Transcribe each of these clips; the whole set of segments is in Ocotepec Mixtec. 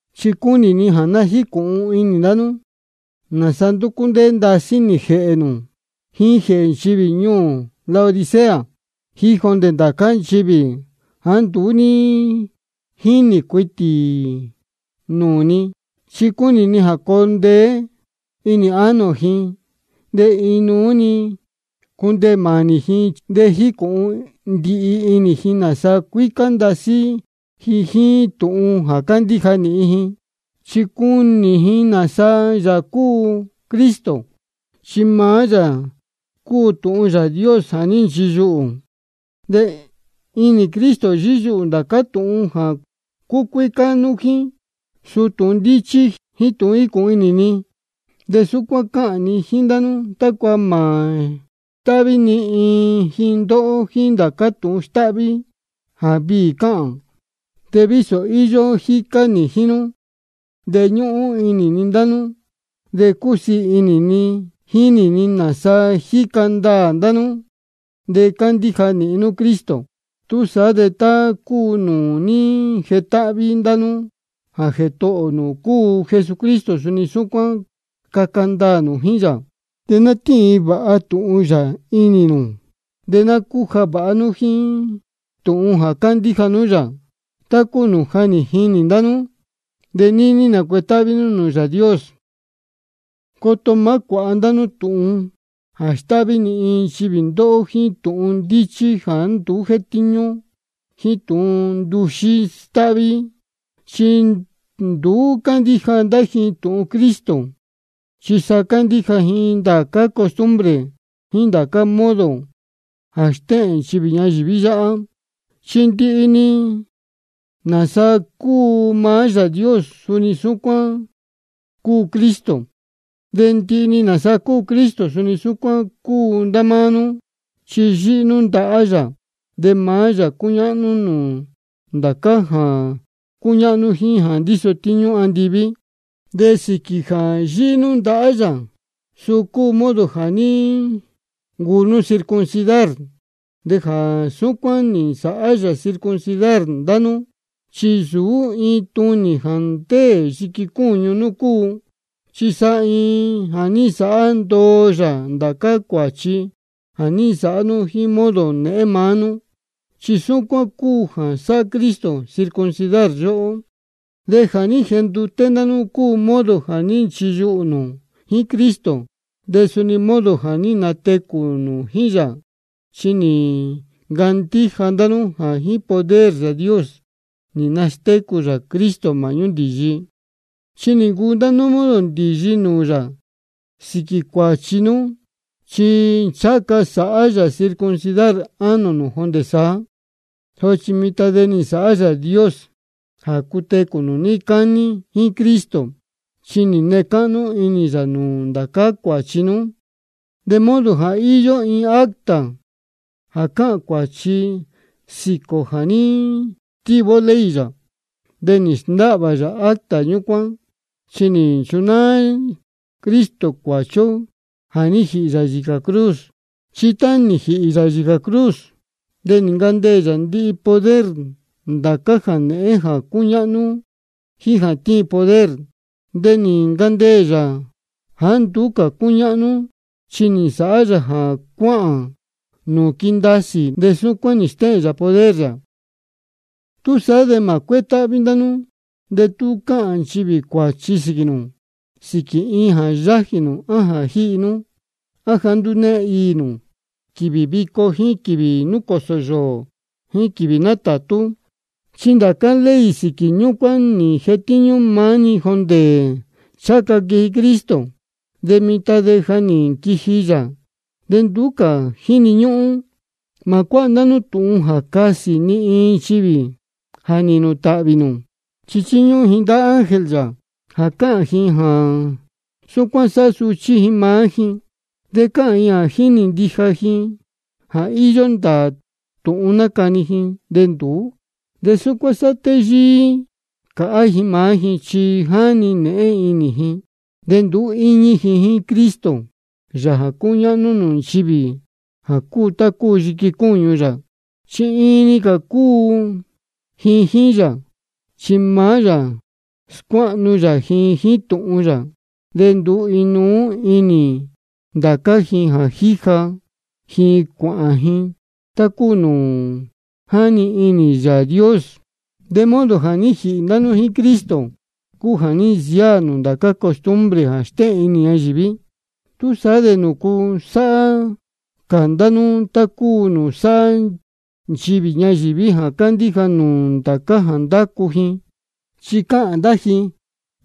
Chi cúnī ni jā ná jícūhun inī ndá nú nāsa ndúcú ndéé ndasí nī jēhē nū, jíín jēhē nchivī ñuū Laodicea, jíín jondē ndācá nchivī jāá nduú ní jínī cuitī nūū ni. Chi cúnī ni jā coo ndeé inī ánō ji, de inuú-ni cundeē mānī ji, de jīcūhun ndihi inī ji nāsa cuícá ndasí ji jíín tūhun jā cándíja nīhin ji. Chi cunī ji nāsa Yāā cúu Cristo, chi maá yā cúu tūhun Yāā Dios jā ní nchiyuhū. De inī Cristo yíyuhū ndācá tūhun jā cúcuícá nú jíín, suu tūhun ndíchí jíín tūhun jícūhun inī. De súcuán cáhān ni jíín ndá nú, tácua mā stáhví ni iin ji ndóhó jíín ndācá tūhun stáhví jā viī cáhān. Chi vísō íyó jícá nī jíín nú, de ñúhún inī ni ndá nú, de cúsiī inī ni jínī ni nāsa jíca ndaā ndá nú de cándíja nīhin nú Cristo. Túsaá de tá cúu nūū ní jetáhví ndá nú jā Jētohō nū cúu Jesucristo, suni súcuán caca ndaā nū jíín yā. De ná tíin vāha tūhun yā inī nū, de ná cúja vāha nú jíín tūhun jā cándíja nú yā, tá cúu nūū ja nī jinī ndá nú. De níní nacuetáhví nú nūū Yāā Dios. Coto má cuāhá ndá nú tūhun jā stáhví ni iin nchivī ndóhó jíín tūhun ndíchí jāá nduú jétíñú, jíín tūhun nduxí stáhví. Chi nduú cándíja ndá ji tūhun Cristo, chi sa cándíja ji ndācá costumbre jíín ndācá modo jā stéhēn nchivī inī ñayīví yáhá. Chi ndihi-ni nāsa cúu maá Yāā Dios, suni súcuán cúu Cristo. De ndihi-ni nāsa cúu Cristo, suni súcuán cúu ndá máá nú, chi yíhí nú ndahá yā. De maá yā cúñáhnú nūū ndācá jā cúñáhnú jíín jā ndíso tíñú andiví. De sīquī jā yíhí nú ndahá yā, suu cúu modo jā ní ncuu nú circuncidar. De jā súcuán nī nsāhá yā circuncidar ndá nú, chi nsūú iin tunī jā ndéē yiqui cúñu nú cúu, chi sa jā ní nsāhá ndoo yā ndācá cuāchi jā ní nsāhá nú jíín modo nēhén maá nú. Chi súcuán cúu jā sáhá Cristo circuncidar yóhó. De jā ní jenduté ndá nú cúu modo jā ní nchiyuhū nū jíín Cristo, de suni modo jā ní natecū nū jíín yā. Chi nī ncandíja ndá nú jā jíín poder Yāā Dios nī nastécū yā Cristo māhñú ndīyi. Chi nī ncuu ndá nú modo ndīyi nūū yā sīquī cuāchi nú, chi ncháha ca sāhá yā circuncidar ánō nū jondē saá. Sochi mitan de nī nsāhá Yāā Dios jā cutecū nū níí cání jíín Cristo, chi nī nee cáhnú inī yā nūū ndācá cuāchi nú. De modo jā íyó iin acta jā cáhān cuāchi sīquī ō jā ní stíví ó ley yā. De nī sndáhvā yā acta ñúcuán, chi nī nchunáá Cristo cuāchi ó jā ní jīhī yā yīcā cruz. Chi tá nī jīhī yā yīcā cruz, de nī ncandeē yā ndihi poder ndācá jānēhén jā cúñáhnú jíín jā tíin poder. De nī ncandeē yā jāá nduú cā cúñáhnú, chi nī nsāhá yā jā cuáhān ndá nūū quindasī, de súcuán nī stéhēn yā poder yā. Túsaá de mā cuétáhví ndá nú de tú cāhān nchivī cuāchi sīquī nū, sīquī iin jā yájī nū á jā jíhi nú, á jāá nduú née iī nū quīvī vico jíín quīvī núcōsō yōō jíín quīvī nátātú. Chi ndācá ley sīquī ñúcuán nī jetíñú maá-ni jondē ncháha ca quiji Cristo. De mitan de ja nī nquiji yā de nduú cā jíni ñúhún. Mā cuáha ndá nú tūhun jā casī ni iin nchivī jā nīhīn nū tāhvī nū. Chi chíñúhún ji ndá ángel yā, de cáhān ji jā súcuán sáhá suchí ji maá ji. De cáhān ji jā jínī ndija ji jā íyó ndāā tūhun nácani ji, de nduú. De súcuán sáhá téyíí cāhá ji maá ji, chi jáni nēhén inī ji. De nduú íñí ji jíín Cristo, Yāā jā cúñáhnú nūū nchivī jā cúu tá cúu yiqui cúñu yā, chi iin-ni cā cúu ji jíín yā. Chi maá yā scuáhnu yā ji jíín tūhun yā, de ndúu inuú inī ndācá ji jā jíja ji cuāhān ji, tá cúu nūū ní jani inī Yāā Dios. De modo jā ní jīhī ndá nú jíín Cristo, cúu jā ní nsiáā nū ndācá costumbre jā stéhēn inī ñayīví. ¿Túsaá de nūcu sáhá cā ndá nú tá cúu nūū sáhá nchivī ñayīví jā cándíja nú ndācá jā ndácu ji? Chi cáhān ndá ji: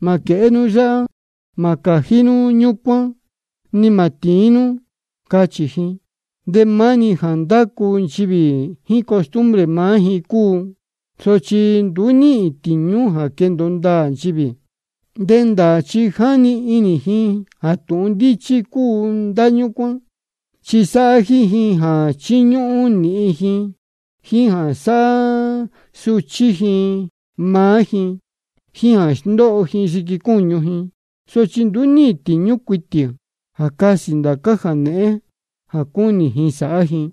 Mā quēhé nú yáhá, mā cājí nú ñúcuán, ni mā tīín nú, cáchī ji. De maá-ni jā ndácu nchivī jíín costumbre maá ji cúu, sochi nduú níhīn tīñú jā quendōo ndāā nchivī. De ndāā chi jáni inī ji jā tūhun ndíchí cúu ndá ñúcuán, chi sáhá jíín ji jā chíñúhún nīhin ji, jíín jā sáhá suchí ji maá ji, jíín jā sndóho ji yiqui cúñu ji. Sochi nduú níhīn tīñú cuitī jā casī ndācá jā nēhén jā cúnī ji sāhá ji.